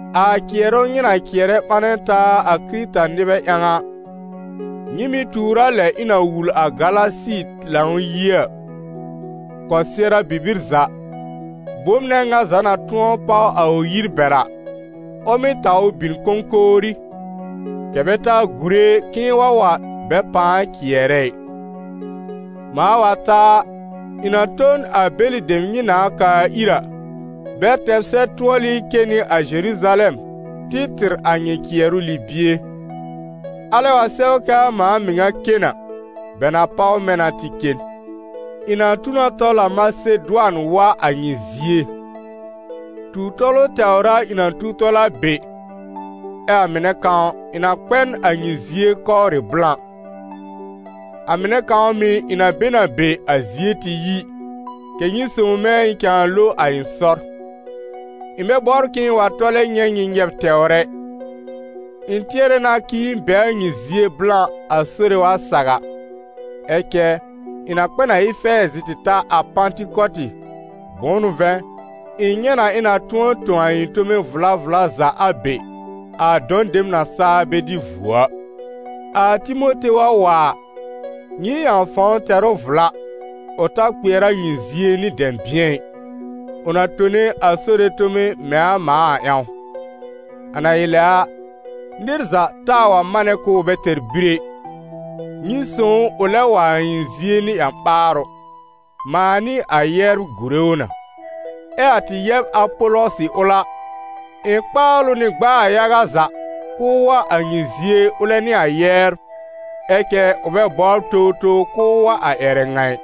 A cɩɛrʋ nyɩ na cɩɛrɛ ɓanɛ taa a Kɩrɩta-nɩbɛ ƴãw a, nyɩ mɩ̀ tuur a lɛ ɩ̃ na wul a Galasi Lãw-yie a. Kɔsɩɛra bibir za, bom nɛ ŋa za na tʋ̃ɔ páw a ʋ yir bɛr a, ʋ mɩ́ taw ʋ bin kõkówrí, kɛ̀ bɛ ta gùre k'ɩ̃ɩ wa wa bɛ pãa cɩɛrɛ ɩ. Mãa wa ta a, ɩ̃ na to n a bɛlɩ dem nyɩ nãá kaa ir a, bɛ tɛr sɛb-tʋɔlɩ cen nɩ a Zeruzalɛm tɩ tɩr a nyɩ cɩɛrʋ libie. Alɛ wa sɛw k'aa mãa mɩŋa cen a, bɛ na páw mɛ̃ na tɩ cen. Ɩ̃ na tu na tɔl a Masedʋan wa a nyɩ zie; tu-tɔlʋ tɛwr a ɩ̃ na tu tɔl a be, ɛ a mɩnɛ kãw, ɩ̃ na kpɛ n a nyɩ zie kɔwrɩ blã; a mɩnɛ kãw mɩ̀ ɩ̃ na be n a be, a zie tɩ yi, kɛ̀ nyɩ sõw mɛ̃ ɩ̃ cãa lo a ɩ̃ sɔr. Ɩ̃ bɛ bɔbr k'ɩ̃ɩ wa tɔlɛ nyɛ̃ nyɩ nyɛb tɛwr ɛ, ɩ̃ tɩɛrɛ na k'ɩ̃ɩ be a nyɩ zie blã, a Sore wa saw a. Ɛ cɛ, ɩ̃ na kpɛ n a Efɛɛzɩ tɩ ta a Pãtɩkɔtɩ, bʋ̃ʋ n'ʋ vɛ̃, ɩ̃ nyɛ̃ na ɩ̃ na tʋ̃ɔ tõ a ɩ̃ tome vla vla za a be, a dɔ̃ dem na saa bɛ dɩ vuo a. A Timote wa wa a, nyɩ ƴãw fãw tɛr ʋ vla, ʋ ta kpɩɛr a nyɩ zie nɩ dɛ̃bɩ̃ɛ ɩ, ʋ na tone a Sore tome mɛ̃ a mãa a ƴãw. A na ɩ lɛ a, nɩr za taa wa manɛ k'ʋʋ bɛ tɛr bir ɛ. Nyɩ sõw ʋ ʋ lɛb wa a ɩ̃ zie nɩ ƴã-ɓaarʋ, mãa nɩ a yɛbr gùre ʋ na. Ɛ a tɩ yɛb Apɔlɔsɩ ʋl a, ɩ̃ kpaal ʋ nɩ gb'aa yaga za k'ʋʋ wa a nyɩ zie ʋlɛ nɩ a yɛbr, ɛ cɛ ʋ bɛ bɔbr towtow k'ʋʋ wa a ƴɛrɛ ŋa ɩ.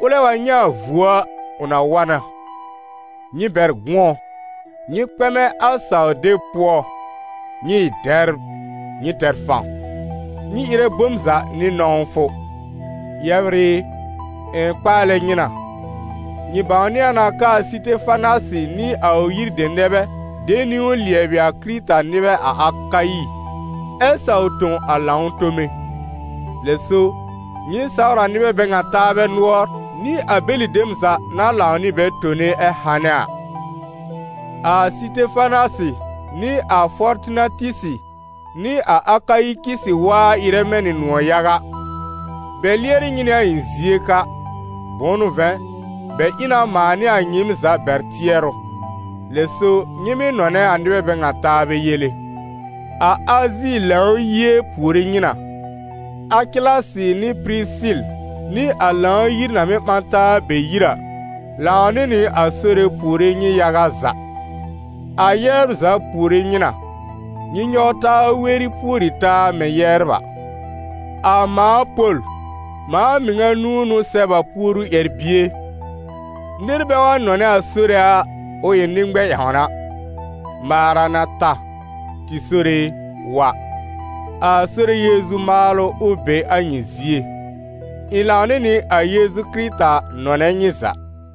Ʋlɛ wa nyɛ̃ a vuo a, ʋ na wa na. Nyɩ bɛr gʋ̃ɔ, nyɩ kpɛmɛ a saw-deb pʋɔ, nyɩ ɩ dɛbr, nyɩ tɛr fãw. Nyɩ ɩrɛ bom za nɩ nɔ̃wfʋ. Yɛbr ɩ, ɩ̃ kpaalɛ nyɩ na: nyɩ bãwnɩ a na k'aa Sɩtefanasɩ nɩ a ʋ yir dem nɛ bɛ de niwn lɩɛbɩ a Kɩrɩta-nɩbɛ a Akayi ɛ saw tõ a lãw tome. Lɛ so, nyɩ sawr a nɩbɛ bɛ ŋa taabɛ nʋɔr, nɩ a bɛlɩ dem za na lãw nɩ bɛ tone ɛ hanɛ a. A Sɩtefanasɩ, nɩ a Fɔrtinatisi nɩ a Akayikisi waa ɩrɛ mɛ̃ nɩ nʋ̃ɔ̀ yaga. Bɛ lɩɛrɩ nyɩ nɩ a ɩ̃ zie ka. Bʋ̃ʋ n'ʋ vɛ̃, bɛ ɩ na mãa nɩ a nyɩɩm za bɛr tɩɛrʋ. Lɛ so, nyɩ mɩ́ nɔnɛ a nɩbɛ bɛ ŋa taabɛ yele. A Azi Lãw-yie puore nyɩ na. Akɩlasɩ nɩ Pɩrɩsɩl nɩ a Lãw-yir na mɩ́ ɓã taa a bɛ yir a, lãw nɩ nɩ a Sore puore nyɩ yaga za. A yɛbr za puore nyɩ na. Nyɩ nyɔw taa weri pùori taa mɛ̃ yɛbr a. A mãa Pol, mãa mɩŋa nũu n'ʋ sɛb a puoru ƴɛr-bie. Nɩr bɛ wa nɔnɛ a Sore a, ʋ ɩ nɩ-ŋmɛ̃-ƴãwna. Marana ta (Tɩ Sore e, wa!) A Sore Yeezu maalʋ, ʋ be a nyɩ zie. Ɩ̃ lãw nɩ nɩ a Yeezu Kɩrɩta nɔnɛ nyɩ za.